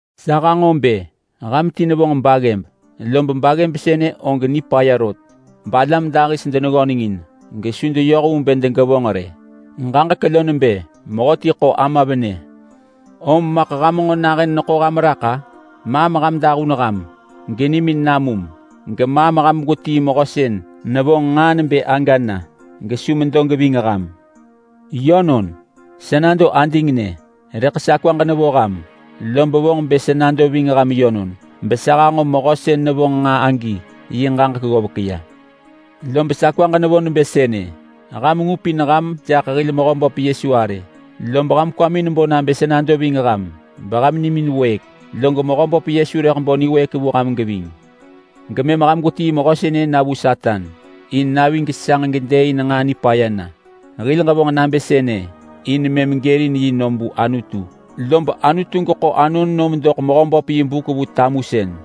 Sa hanġo bë ham ti nevonġ baggëb, lob baggëb sënë og nipaya rot balam dahis deneggönengin gesu deyoh vu bë degevonġ rë. Ġaġek lo nebë mehöti ḳo ama venë. Om maḳ ham nġo nahën neḳo ham raḳ-a? Maam ham dahun ham genimin namum! Gemaam ham gwetii mehö sën nevonġ nġaa nebë aga na gesu medo geving ham! Yönon, sa nado adingnë rëḳ sa kwaġ nevo ham. Lob vonġ bë sa nado ving ham yönon besa hanġo mehö sën nevonġ nġaa agi yi ġaġek ggovek ya. Lob sa kwaġ nevo nebë sënë: Ham ngupin ham jaḳ hil Mehöböp Yesu arë, lob ham kwamin bo nabë sa nado ving ham beham nimin wëëk, log Mehöböp Yesu rëḳ bo niwëëk vu ham geving. Gemëm ham gwetii mehö sënë na vu Satan in navi gesanġ gedëëin nġaa nipaya na. Hil ġevonġ nabë sënë in mëm gërin yi nom vu Anutu, lob Anutu geḳo anon nom doḳ Mehöböp yi buk vu tamusën.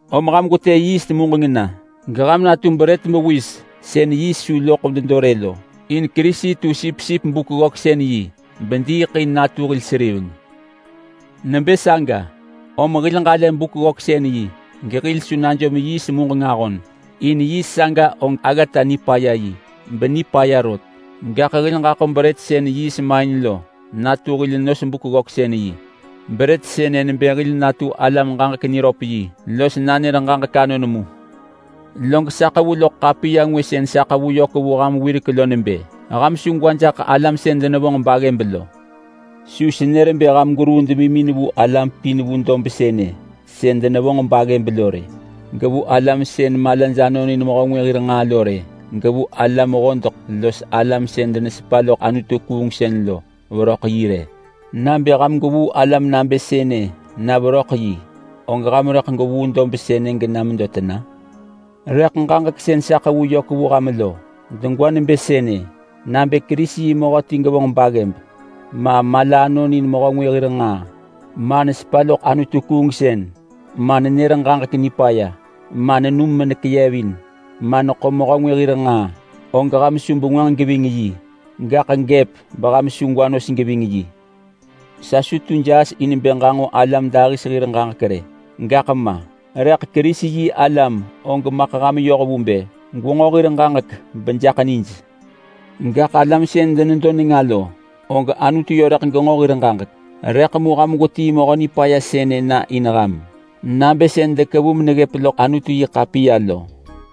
Om ham gwetë yiist muġeng na geham natu brët mewis sën yiist su loḳ nedo rë lo. In Kerisi tu sipsip Buk-ggöksën-yi bediiḳ in natu hil seriveng. Nebë saga om hil ġalë Buk-ggöksën-yi gehil su najom yiist muġeng ahon, in yiist saga og aggata nipaya yi benipaya rot. Gaḳ hil ġaḳo brët sën yiist main lo natu hil nos Buk-ggöksën-yi. Brët sënë nebë hil natu alam-ġaġek-niröp-yi los nanër ġaġek anon mu. Log sa ḳevu loḳ ḳapiya ngwë sën sa ḳevu yök vu ham wirek lo nebë ham su gwa jaḳ alam sën denevonġ baggëb lo. Sa su nër bë ham gweruu demimin vu alam pin vu dob sënë sën denevonġ baggëb lo rë, gevu alam sën malaj anonin mehö ngwë hir nġaa lo rë, gevu alam hodeḳ los alam sën denesepa loḳ anutu-kuungsën lo veröḳ yi rë. Nabë ham gwevuu alam nabë sënë na veröḳ yi, og ham rëḳ gwevuu dob sënë gena medo tena? Rëḳ ġaġek sën sa ḳevu yök vu ham lo degwa nebë sënë: Nabë Kerisi yi mehö ti gevonġ baggëb ma, mala anonin mehö ngwë hir nġaa ma, nesepa loḳ anutu-kuungsën ma, nenër ġaġek nipaya ma, nenum menekeyevin ma, neḳo mehö ngwë hir nġaa, og ham su bengwënġ geving yi! Gaḳ gëp beham su gwa nos geving yi. Sa su tu jaas in bë ġanġo alam dahis hir ġaġek rë gaḳ ma, rëḳ Kerisi-yi-alam og maḳ ham yoh vu bë gwenġo hir ġaġek bejaḳ nij. Gaḳ alam sën denedo nenga lo, og Anutu yö rëḳ genġo hir ġaġek. Rëḳ mu ham gwetii mehö nipaya sënë na in ham, nabë sën dekevu meneggëp loḳ Anutu-yi-ḳapiya lo.